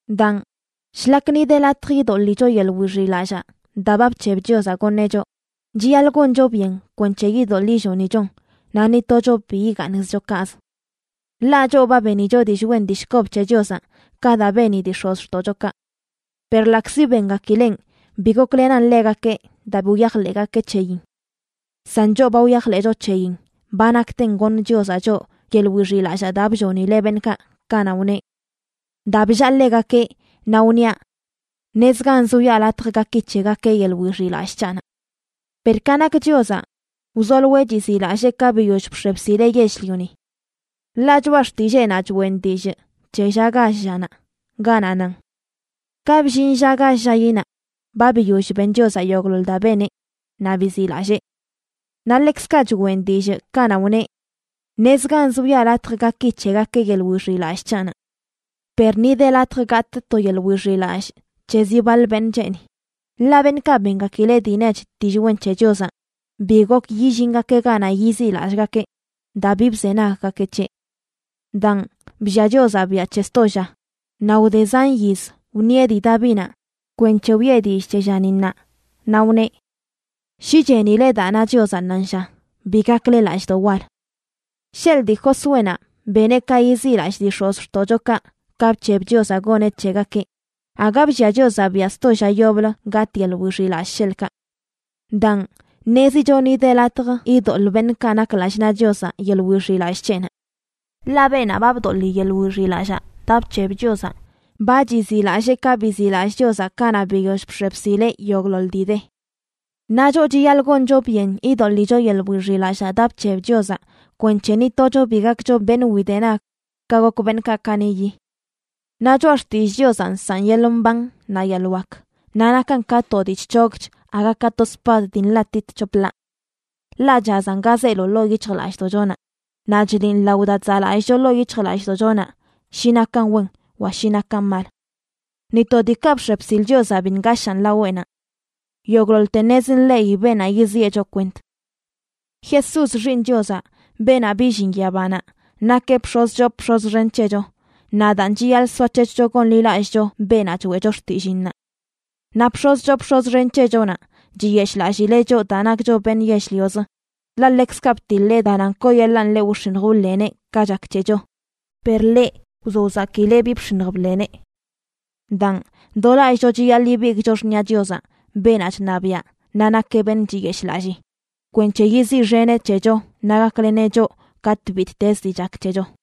Daan, shlak ni de latj idoḻicho yeḻꞌ wixiꞌlallaa daa ba bc̱heb Chiozaꞌ goṉeꞌ choꞌ, chiyaḻꞌ goncho byen kwenc̱he idoḻꞌ illonichon naꞌ ni tocho bi igaaṉzcho kaꞌz. Ḻaꞌ choꞌ ba benicho dillꞌ wen dillꞌ kob c̱he Chiozaꞌ, ka daa beni dii x̱ozxtoꞌchokaꞌ. Per ḻaꞌkzi bengakileꞌn, bi goklenan ḻegakeꞌ daa bi wyajḻeꞌgakeꞌ c̱heyin. San choꞌ ba wyajḻeꞌcho c̱heyin ba nakten goṉ Chiozaꞌ choꞌ yeḻꞌ wixiꞌlallaa daa bllonileꞌ beṉꞌkaꞌ kanaꞌ wneꞌ: Daa bllaa ḻegakeꞌ naꞌ wniaꞌ: ṉezganz wiꞌa latj gaki c̱hegakeꞌ yeḻꞌ wixiꞌlallꞌ c̱haꞌnaꞌ. Per ka nak Chiozaꞌ, wzoloeꞌ chiziꞌlallee ka biyoll bx̱e bsileꞌ yell-lioni. Ḻaꞌ Choꞌa Xtilleenaꞌ choꞌen dillꞌ c̱he lla gall llanaꞌ, ganaꞌ nan: Ka bllin lla gall llayinaꞌ, ba biyoll ben Chiozaꞌ yogꞌḻoḻ daa beneꞌ, naꞌ biziꞌlallee. Naꞌ ḻekzkaꞌ choꞌen dillꞌ kanaꞌ wneꞌ: Ṉezganz wiꞌa latj gaki c̱hegakeꞌ yeḻꞌ wixiꞌlallꞌ c̱haꞌnaꞌ. Per ni de latj gatꞌ to yeḻꞌ wixiꞌlallꞌ c̱he zi baḻ beṉꞌ cheeni, ḻaꞌ beṉꞌkaꞌ bengakileꞌ dii nech dillꞌ wen c̱he Chiozaꞌ bi gok yillingakeꞌ ganaꞌ yiziꞌlallꞌgakeꞌ daa bi bzenaggakeꞌ c̱heꞌ. Daan, bllia Chiozaꞌ biaꞌ c̱he sto lla, naꞌ wde zan yiz wṉieꞌ dii Davinaꞌ kwenc̱he wiꞌe dillꞌ c̱he llani ṉaa, naꞌ wneꞌ: Shi chenile daa na Chiozaꞌ ṉaanlla, bi gakle lallꞌdoꞌ wal. Sheḻꞌ dii Josuénaꞌ beneꞌ ka yiziꞌlallꞌ dii x̱ozxtoꞌchokaꞌ ka bc̱heb Chiozaꞌ goneꞌ c̱hegakeꞌ, aga bllia Chiozaꞌ biaꞌ sto lla yoblə gatꞌ yeḻꞌ wixiꞌlallꞌ, sheḻꞌkaꞌ. Daan, ṉezicho ni de latj idoḻꞌ beṉꞌkaꞌ nak lallꞌ naꞌ Chiozaꞌ yeḻꞌ wixiꞌlallꞌ c̱heꞌnaꞌ. Ḻaꞌ beenaꞌ ba bdoḻi yeḻꞌ wixiꞌlallaa daa bc̱heb Chiozaꞌ, ba chiziꞌlallee ka biziꞌlallꞌ Chiozaꞌ kanaꞌ biyoll bx̱e bsileꞌ yogꞌḻoḻ dii de. Naꞌ choꞌ chiyaḻꞌ goncho byen idoḻicho yeḻꞌ wixiꞌlallaa daa bc̱heb Chiozaꞌ kwenc̱he ni tocho bi gakcho beṉꞌ widenag ka gok beṉꞌkaꞌ kaniꞌyi. Naꞌ choꞌa xtillꞌ Chiozaꞌ nsaꞌn yeḻꞌ mban naꞌ yeḻꞌ wak, naꞌ nakan ka to dii chc̱hogch aga ka to spad dii nḻatit c̱hop ḻaa. Ḻaꞌ chazan ga zeelo ḻoo yic̱hjlallꞌdoꞌchonaꞌ. Naꞌ chliꞌn lao daa chzaꞌlallꞌcho ḻoo yic̱hjlallꞌdoꞌchonaꞌ shi nakan wen wa shi nakan mal. Ni to diikaꞌ bx̱e bsil Chiozaꞌ bi ngashaan laweꞌnaꞌ. Yogꞌḻoḻte ṉez nḻeꞌi beenaꞌ yiziꞌe choꞌ kwent. Jesús, Xiiṉ Chiozaꞌ, beenaꞌ billin yabanaꞌ, nakeꞌ bx̱oz choo bx̱oz xen c̱hecho, naꞌ daan chiyaḻꞌ soac̱hec̱hcho gonḻilallꞌcho beenaꞌ choeꞌcho xtilliinnaꞌ. Naꞌ bx̱oz choo bx̱oz xen c̱hechonaꞌ chiyeshꞌlallileꞌ choꞌ daa nakcho beṉꞌ yell-lioz, ḻaꞌ ḻekzkaꞌ btiḻeꞌ daa nan kooyeḻaan ḻeꞌ wx̱iṉj wḻeneꞌ ka chak c̱hecho, per ḻeꞌ, wzo wzakileꞌ bi bx̱iṉj bḻeneꞌ. Daan, do lallꞌcho chiyaḻꞌ ibigꞌcho xṉiꞌa Chiozaꞌ, beenaꞌ chṉabiaꞌ naꞌ nakeꞌ beṉꞌ chiyeshꞌlallii, kwenc̱he yiziꞌxeneꞌ c̱hecho naꞌ gakleneꞌ choꞌ katꞌ bittezə dii chak c̱hecho.